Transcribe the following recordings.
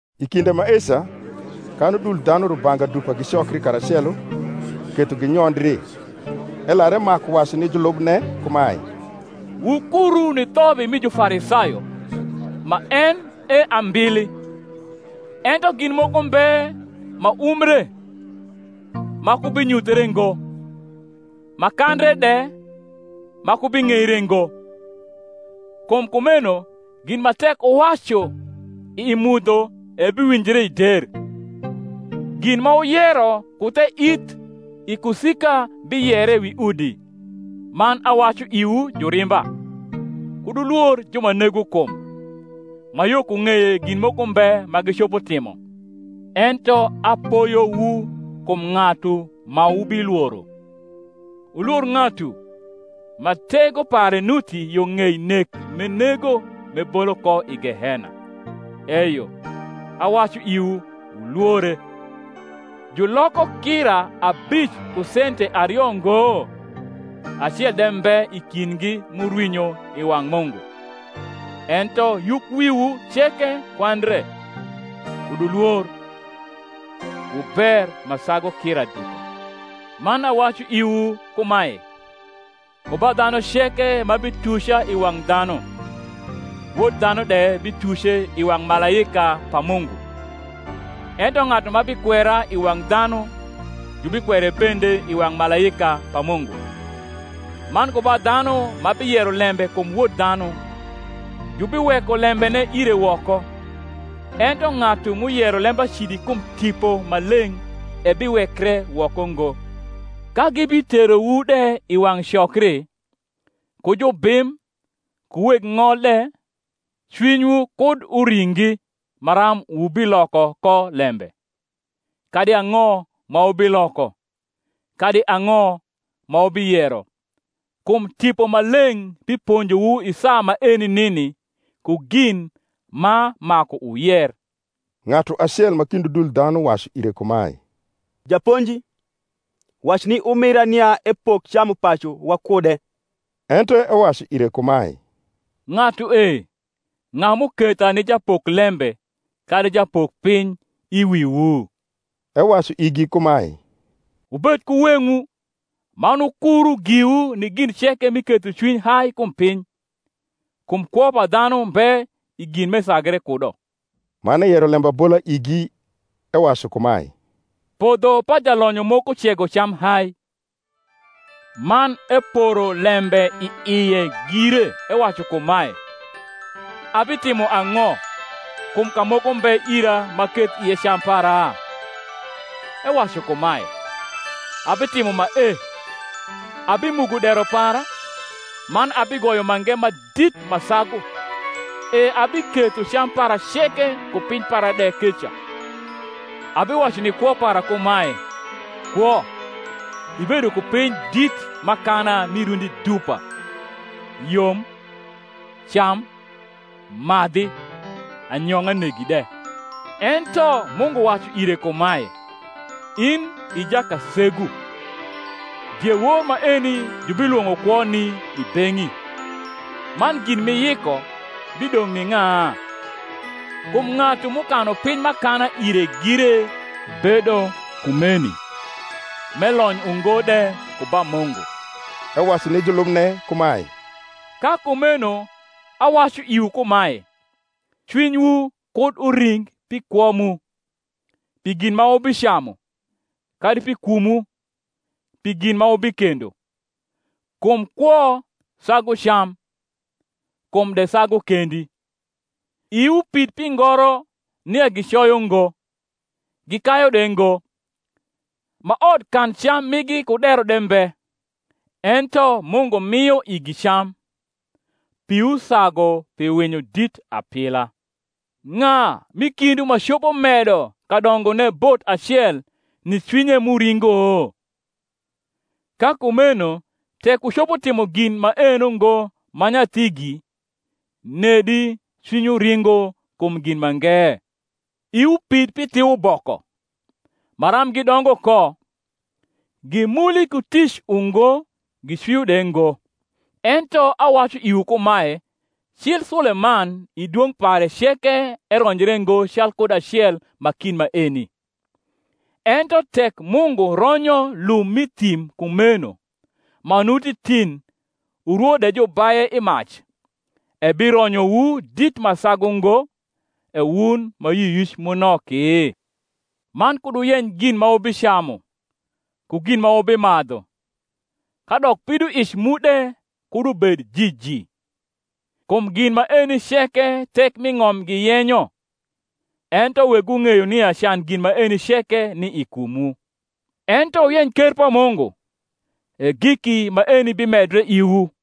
I kinde maeca, kan udul dhanu rubanga dupa gicokri karacelo, ketho ginyondri, elar emaku wacu ni julubne kumae, Wukuru ni thobi rni Jufarisayo, ma en e ambili. Ento gin moko mbe ma umbre, ma ku binyuthre ngo; ma kandre de ma ku bing’eire ngo. Kum kumeno gin ma tek wuwacu i mudho ebiwinjre i der; gin ma wuyero ku the ith i kusika biyere wi udi. Man awacu iwu jurimba, Kud wulwor ju ma nego kum, ma yo ku ng’eye gin moko mbe ma gicopo timo. Ento apoyowu kum ng’atu ma wubilworo: Wulwor ng’atu, ma tego pare nuti yo ng’ei nek m’enego m’ebolo ko i gehena; eyo, awacu iwu, Wulwore. Juloko kira abic ku sente ario ngo? acel de mbe i kindgi m’urwinyo i wang’ Mungu. Ento yukwiwu ceke kwandre. Kud wulwor: wu ber ma sagu kira dupa. Man awacu iwu kumae, Ku ba dhanu ceke ma bituca i wang’ dhanu, Wod dhanu de bituce i wang’ malaika pa Mungu: ento ng’atu ma bikwera i wang’ dhanu jubikwere bende i wang’ malaika pa Mungu. Man ku ba dhanu ma biyero lembe kum Wod dhanu, jubiweko lembene ire woko: ento ng’atu m’uyero lembacidi kum Tipo Maleng’ ebiwekre woko ngo. Ka gibiterowu de i wang’ cokri, ku jubim, ku weg ng’ol de, cwinywu kud uringi maram wubiloko ko lembe, kadi ang’o ma wubiloko, kadi ang’o ma wubiyero: kum Tipo Maleng’ biponjowu i saa maeni nini ku gin ma maku wuyer. Ng’atu acel ma kind udul dhanu wacu ire kumae, Japonji, wac ni umira nia epok camupacu wakude. Ento ewacu ire kumae, Ng’atu e, ng’a m’uketha ni japoklembe kadi japokpiny i wiwu? Ewacu igi kumae, Wubed ku weng’wu, man wukuru giwu ni gin ceke mi kethocwiny hai kum piny: kum kwo pa dhanu mbe i gin m’esagre kudo. Man eyero lembabola igi, ewacu kumae, Podho pa jalonyo moko cego cam hai: man eporo lembe i ie gire, ewacu kumae, Abitimo ang’o, kum kamoko mbe ira m’aketh ie cam para? Ewacu kumae, Abitimo mae: Abimugo dero para, man abigoyo mange ma dit ma sagu; e abiketho cam para ceke ku piny para de keca. Abiwacu ni kwo para kumae, Kwo, ibedo ku piny dit m’akana mi rundi dupa; yom, cam, madhi, anyong’a negi de. Ento Mungu wacu ire kumae, In i jakasegu, diewor maeni jubilwong’o kwoni i beng’i; man gin m’iyiko, bidong’ ni ng’a? Kum ng’atu m’ukanu piny m’akana ire gire bedo kumeni, m’elony ungo de ku ba Mungu. Ewacu ni julubne kumae, Ka kumeno awacu iwu kumae, Cwinywu kud uring pi kwo mu, pi gin ma wubicamu; kadi pi kumwu, pi gin ma wubikendo. Kum kwo sagu cam, kum de sagu kendi. Iwu pid pi ngoro nia gicoyo ngo, gikayu de ngo; ma odkancam migi ku dero de mbe; ento Mungu mio igi cam: piwu sagu pi winyo dit apila! Ng’a m’i kindwu ma copo medo kadongone bot acel ni cwinye m’uringo? Ka kumeno tek wucopo timo gin maeno ngo ma nyathigi, nedi cwinywu ringo kum gin mange? Iwu pid pi thiuboko, maram gidongo ko: gimuli ku tic ungo, gicwio de ngo; ento awacu iwu kumae, Cil Suleman i dwong’ pare ceke eronjre ngo calkud acel ma kind maeni. Ento tek Mungu ronyo lum m’i thim kumeno, ma nuti tin, urwo de jubaye i mac; ebironyowu dit ma sagu ngo, E wun ma yioyic mu noki? Man kud wuyeny gin ma wubicamu, ku gin ma wubimadhu, kadok pidoic mu de kud ubed jiji. Kum gin maeni ceke thek m’i ng’om giyenyo: ento Wegwu ng’eyo nia can gin maeni ceke ni i kumwu. Ento wuyeny ker pa Mungu, e giki maeni bimedre iwu.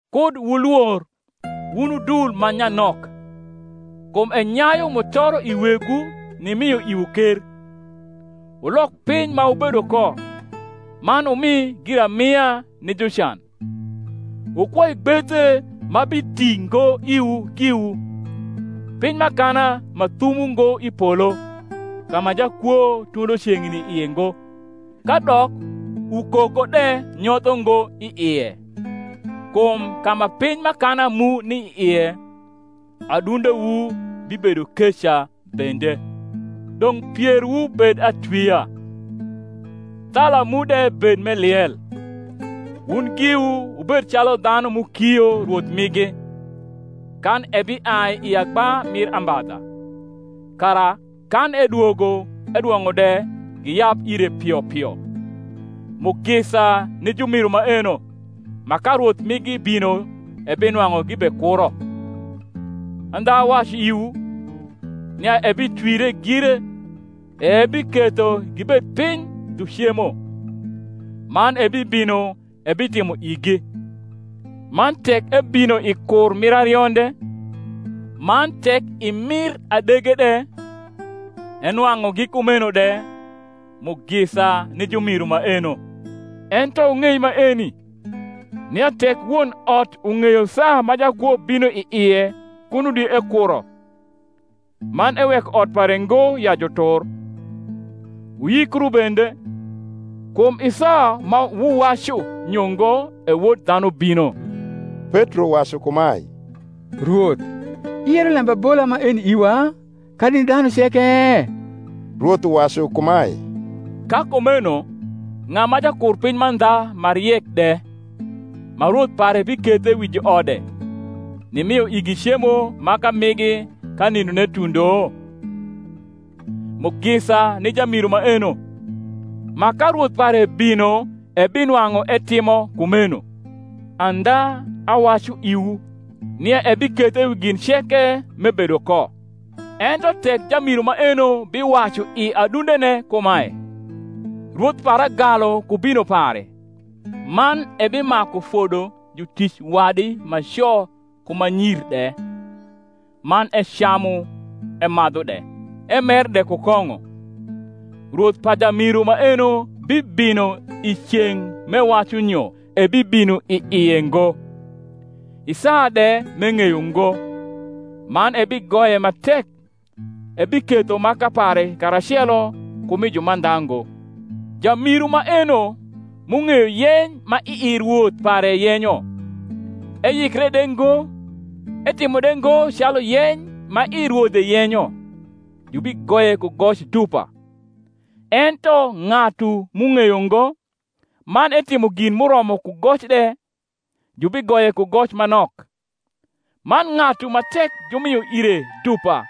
Kud wulwor, wun udul ma nyanok; kum enyayu mutoro i Wegwu nimio iwu ker. Wulok piny ma wubedo ko, man wumi giramia ni jucan; wukwoi gbethe ma biti ngo iwu giwu, piny m’akana ma thum ungo i polo, ka ma jakwo tundo ceng’ni i ie ngo, kadok ukoko de nyotho ngo i ie. Kum ka ma piny m’akana mu ni ie, adundewu bibedo keca bende. Dong’ pierwu bed atwia, thala mu de bed m’eliel; wun giwu wubed calu dhanu m’ukio rwoth migi, kan ebiai i agba mir ambadha; kara, kan edwogo edwong’o de, giyab ire pio pio. Mugisa ni jumiru maeno, ma ka rwoth migi bino ebinwang’u gibekuro: andha awacu iwu, nia ebitwire gire, e ebiketho gibed piny dhu cemo, man ebibino ebitimo igi. Man tek ebino i kur mir arionde, man tek i mir adege de, enwang’ugi kumeno de, mugisa ni jumiru maeno. Ento wung’ei maeni, nia tek won ot ung’eyo saa ma jakwo bino i ie kuno di ekuro, man eweko ot pare ngo ya jutur. Wuyikru bende: kum i saa ma wuwacu nyo ngo e Wod dhanu bino. Petro wacu kumae, Rwoth, iyero lembabola maeni iwa, kadi ni dhanu ceke? Rwoth uwacu kumae, Ka kumeno ng’a ma jakurpiny mandha ma riek de, ma rwoth pare bikethe wi juode, nimio igi cemo maka migi ka nindone tundo? Mugisa ni jamiru maeno, ma ka rwoth pare bino ebinwang’u etimo kumeno. Andha awacu iwu, nia ebikethe wi gin ceke m’ebedo ko. Ento tek jamiru maeno biwacu i adundene kumae, Rwoth para galu ku bino pare; man ebimaku fodo jutic wadi ma co ku ma nyir de, man ecamu emadhu de, emer de ku kong’o; rwoth pa jamiru maeno bibino i ceng’ m’ewacu nyo ebibino i ie ngo, i saa de m’eng’eyo ngo, man ebigoye ma tek, ebiketho maka pare karacelo ku mi jumandha ngo. Jamiru maeno, m’ung’eyo yeny ma ii rwoth pare yenyo, eyikre de ngo, etimo de ngo calu yeny ma ii rwodhe yenyo, jubigoye ku goc dupa; ento ng’atu m’ung’eyo ngo, man etimo gin m’uromo ku goc de, jubigoye ku goc ma nok. Man ng’atu ma tek jumio ire dupa,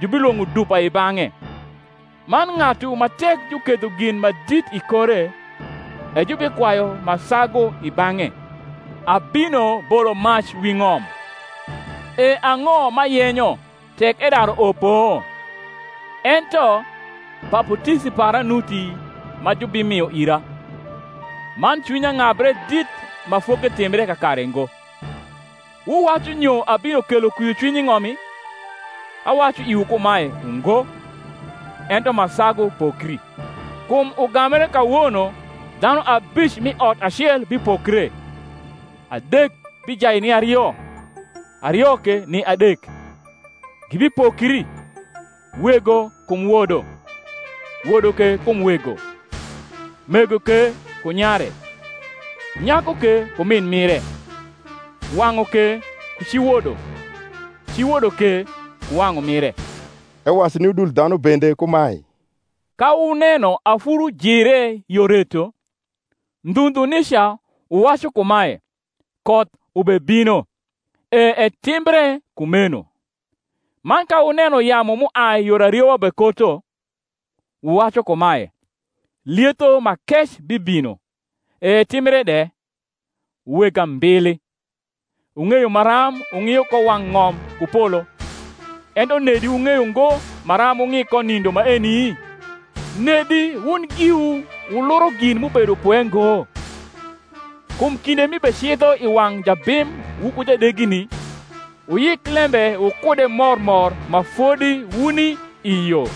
jubilwong’o dupa i bang’e: man ng’atu ma tek juketho gin ma dit i kore, e jubikwayu ma sagu i bang’e. Abino bolo mac wi ng’om; e ang’o m’ayenyo, tek edaru opo? Ento baputisi para nuti ma jubimio ira; man cwinya ng’abre dit ma foketimbre kakare ngo! Wuwacu nyo abino kelo kwiocwiny i ng’omi? Awacu iwu kumae, Ungo; ento ma sagu pokri: kum ugambre kawono dhanu abic m’i ot acel bipokre, adek bijai ni ario, ario ke ni adek. Gibipokri, wego kum wodo, wodo ke kum wego; mego ke ku nyare, nyaku ke ku min mire; wang’u ke ku ci wodo, ci wodo ke ku wang’u mire. Ewacu ni udul dhanu bende kumae, Ka wuneno afuru jire yo reto, ndhu ndhu nica wuwacu kumae, Koth ubebino; e etimbre kumeno. Man ka wuneno yamu m’uai yor ariwa bekoto, wuwacu kumae, Lietho ma kec bibino; e etimbre de. Wu weg ambili, wung’eyo maram wung’io ko wang’ ng’om ku polo; ento nedi wung’eyo ngo maram wung’i ko nindo maeni? Nedi wun giwu wuluro gin m’ubedo pwe ngo? Kum kinde m’ibecidho i wang’ jabim wuku jadegini, wuyik lembe wukude mor mor ma fodi wuni i yo;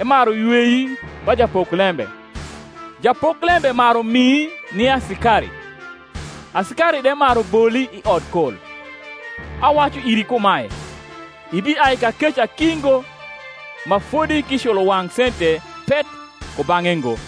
emaru ywei ba japoklembe, japoklembe maru mii ni asikari, asikari de maru boli i odkol. Awacu iri kumae, Ibiai kakeca ki ngo, ma fodi k’iculo wang’ sente pet kubang’e ngo.